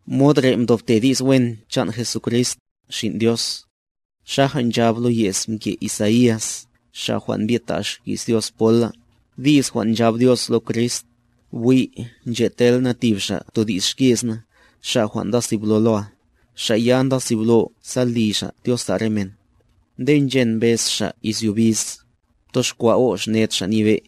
Mod re' mdobte di's wen chan' Jesucrist, Xin' Dios. Xaja nchab lo ye's mke' Isaías, xa' jwan' mbye'd ta' xki's Dios pola,a di's jwan' nchab Dios lo Crist: Bwi' nche' tel na tib xa' todi's xki's na, xa' jwan' nda siblo loa, xa' ya nda siblo sa li xa' tyosa' re men. Nde nchen mbez xa' izyo biz, nchab xa': “Ptoxkwa' go' xned Xa' Nyebe';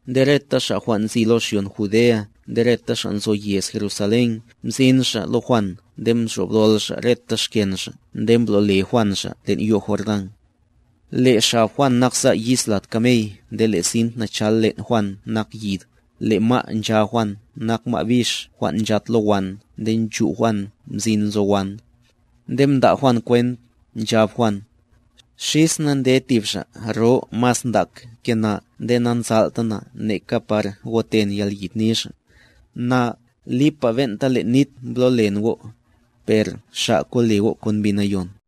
Nde reta xa' jwan' nzi lo xyon Judea nde reta xa' nzo yez Jerusalén mzin xa' lo Juan nde mxobdol xa' reta xken xa' nde mblole Juan xa' len' yo' Jordán. Le' xab Juan naksa' yis lad kamey nde sint nachal len' Juan nak yid; le' ma' ncha Juan nak ma' bix jwan' nchat lo wan nde nchu' Juan mzin nzo wan. Nde mda' Juan kwent, nchab Juan: —Xis na nde tib Xa' ro mas ndak ke na nde nansal'ta na neka par goten yalyid ni Xa'. Na, lipa ben'ta len' nit mblolen go'; per Xa' kole go' kon Mbi Nayon.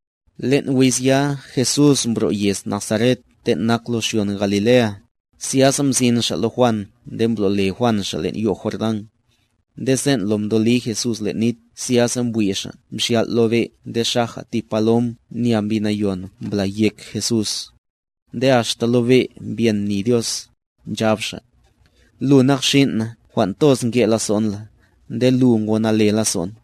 Len' wiz ya, Jesús mbro' yez Nazaret ten' nak lo xyon Galilea, zyasa mzin Xa' lo Juan nde mblole Juan Xa' len' yo' Jordán. Nde sen' lo mdoli Jesús len' nit zyasa mbwi' Xa' mxyal' lo be' nde xaja tib palom mbla Mbi Nayon yek Jesús. Nde axta lo be' mbyen mni Dios, nchab Xa': —Lu nak Xin' na jwan' toz nke' lazo'n la; nde lu ngo nale lazo'n.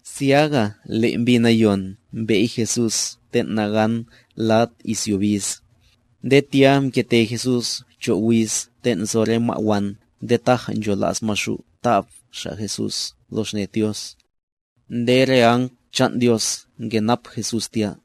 Zyaga le' Mbi Nayon mbe'y Jesús ten' nagan lad izyo biz. Nde tya mkete Jesús cho' wiz ten' nzo re ma' wan nde taja nchola's Maxu' tab xa' Jesús lo xned Dios. Nde re áng chan' Dios mkenap Jesús tya.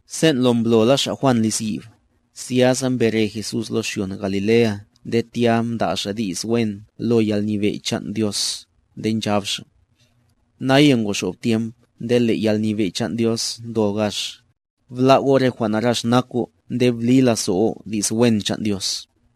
Sen' lo mblola xa' Juan liz yib, zyasa mbere Jesús lo xyon Galilea nde tya mda' Xa' di's wen lo yalnyebe' chan' Dios, nde nchab xa': —Naya ngoxob tyemp nde le' yalnyebe' chan' Dios ndo gax; bla' go' re jwan' narax nak go' nde bli lazo' go' di's wen chan' Dios.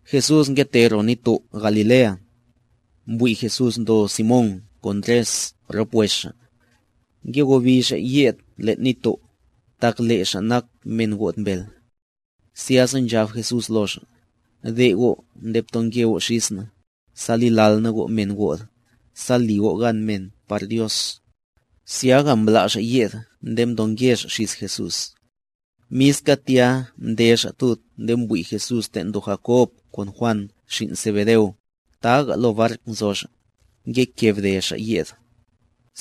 Jesús ngete ro nitto' Galilea, mbwi' Jesús ndo Simón kon Ndres rop wes xa', nge gobi xa' yed len' nitto'; tak le' xa' nak men god mbel. Zyasa nchab Jesús lo xa': —De' go' nde ptonke go' xis na, sa lilal na go' men god, sa li go' gan men par Dios. Zyaga mbla' xa' yed nde mdonke xa' xis Jesús. Miska tya mde xa' tud nde mbwi' Jesús ten' ndo Jakob kon Juan xin' Zebedeo, taga lo bark nzo xa', nge ke'bde xa' yed.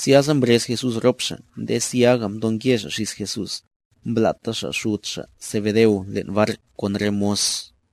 Zyasa mbrez Jesús rop xa' nde zyaga mdonke xa' xis Jesús, mbla'ta xa' xud xa' Zebedeo len' bark kon re mos.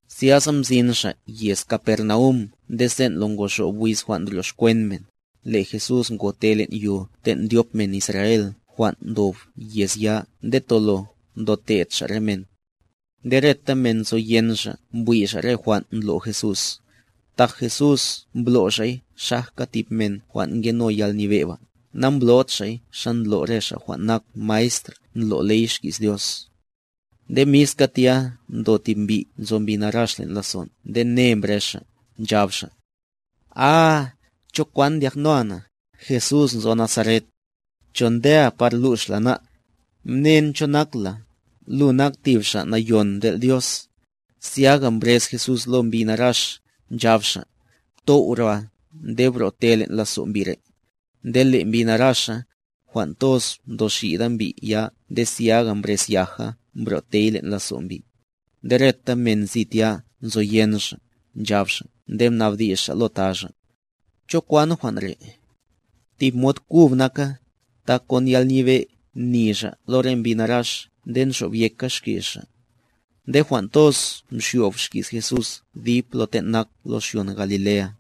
Zyasa mzin xa' yez Capernaum nde sen' lo ngoxob wiz jwan' ndryoxkwen men, le' Jesús ngote len' yo ten' ndyop men Israelc jwan' ndob yez ya nde tolo mtote'd Xa' re men. Nde reta men nzoyen xa' mbwi' xa' re jwan' ndlo' Jesús; tak Jesús mblo' Xa'y xajka tib men jwan' ngeno yalnyebe' ba, namblo'd Xa'y xa ndlo' re xa' jwan' nak maestr ndlo' ley xki's Dios. Nde miska tya ndo tib mbi' nzo mbi narax len' lazon' nde ne mbrez xa', nchab xa': —¡Aah! ¿Cho kwan ndyaknoa ná', Jesús nzo Nazaret? ¿Cho ndea par lux la ná'? Mnen cho nak la, lu nak tib Xa' Nayon mtel' Dios. Zyaga mbrez Jesús lo mbi narax, nchab Xa': —¡Btow' roa nde bro'te len' lazo' mbi' re'! Nde le' mbi naraxa, jwan' toz mdoxida mbi' ya nde zyasa mbrezyaja mbro'tey len' lazo' mbi'. Nde reta men nzi tya nzoyen xa', nchab xa' nde mnabdi's xa' lo ta xa': —¿Cho kwan jwan' re'? ¡Tib mod kub naka, tak kon yalnyebe' ni Xa' lo re mbi narax nde nxobyeka xki's Xa'! Nde jwan' toz mxyob xki's Jesús dib plo ten' nak lo xyon Galilea.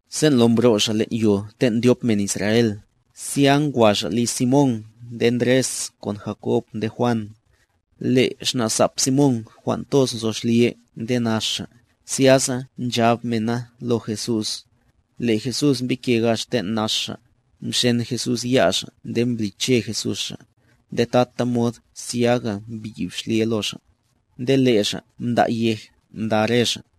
Sen' lo mbro' xa' len' yo ten' ndyop men Israel, zya ngwa xa' liz Simón nde Ndres kon Jakob nde Juan. Le' xna'sap Simón jwan' toz nzo xlye nde nax xa', zyasa nchab mena lo Jesús. Le' Jesús mbike gax ten' nax xa', mxen Jesús ya' xa' nde mbliche Jesús xa'; nde tata mod zyaga mbyib xlye lo xa', nde le' xa' mda' yej mda re xa'.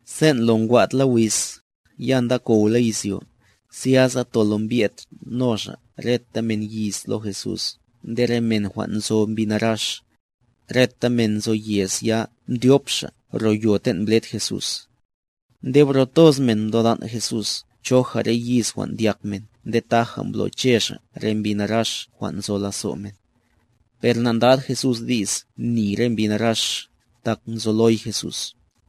Sen' lo ngwadla wiz, ya ndakowla izyo, zyasa tolo mbye'dno xa' reta men yiz lo Jesús nde re men jwan' nzo mbi narax. Reta men nzo yez ya mdyop xa' ro yo ten' mbled Jesús. Nde bro toz men mtodan' Jesús choja re yiz jwan' ndyak men nde taja mblo'che Xa' re mbi narax jwan' nzo lazo' men. Per nandat Jesús di's ni re mbi narax, tak nzoloy Jesús.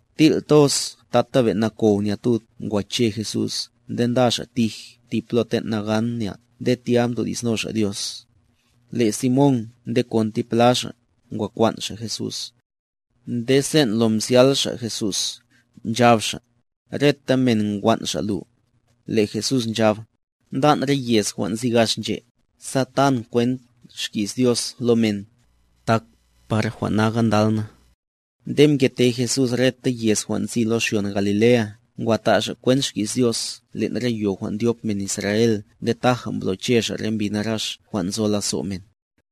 Til' toz tata ben' nakow nya tud ngoche Jesús nde nda xa' tij tib plo ten' nagan nya nde tya mdodi'sno Xa' Dios. Le' Simón nde kon ti pla xa', ngwa kwan' xa' Jesús. Nde sen' lo mzyal xa' Jesús, nchab xa': —¡Reta men nkwan' xa' lu! Le' Jesús nchab: Ndan' re yez jwan' nzi gax nche', sa tan kwent xki's Dios lo men; tak par jwan' na ndal na. Nde mkete Jesús reta yez jwan' nzi lo xyon Galilea ngwa ta' Xa' kwent xki's Dios len' re yo jwan' ndyop men Israel nde taja mblo'che Xa' re mbi narax jwan' nzo lazo' men.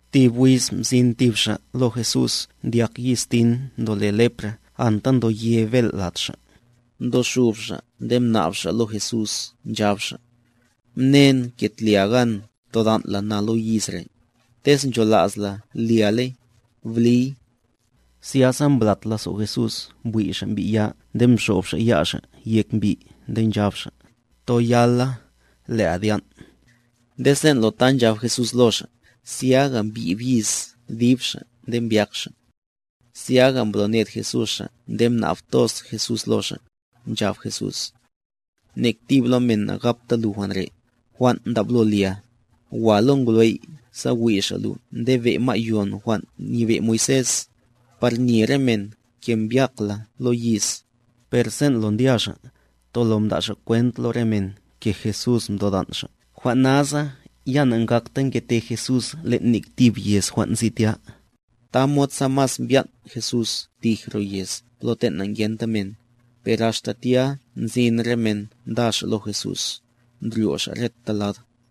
Tib wiz mzin tib xa' lo Jesús ndyak yiz tin ndole lepra anta ndoye bel' lad xa', mdoxub xa' nde mnab xa' lo Jesús, nchab xa': —Mnen ke tlia gan todan' la na lo yiz re', tez nchola's la lia ley, bliy. Zyasa mblat lazo' Jesús mbwi' Xa' mbi' ya nde mxob ya' Xa' yek mbi' nde nchab Xa': —Toyala, le'a dyan'. Nde sen' lo ta nchab Jesús lo xa', zyaga mbyib yiz dib xa' nde mbyak xa'. Zyaga mbloned Jesús xa' nde mnab toz Jesús lo xa', nchab Jesús: —Nek tib lo men nagapta lu jwan' re', jwan' ndablo lia, wa lo ngwley' sa wi' xa' lu nde be' ma' yon jwan' nyebe' Moisés, par nye re men ke mbyak la lo yiz. Per sen' lo ndya xa', tolo mda' xa' kwent lo re men ke Jesús mtodan' xa', jwan' nasa ya nangakta ngete Jesús len' nek tib yez jwan' nzi tya, tamod sa mas mbyan' Jesús tij ro yez plo ten' na'ngenta men, per axta tya nzin re men nda xa' lo Jesús, ndryo' xa' reta lad.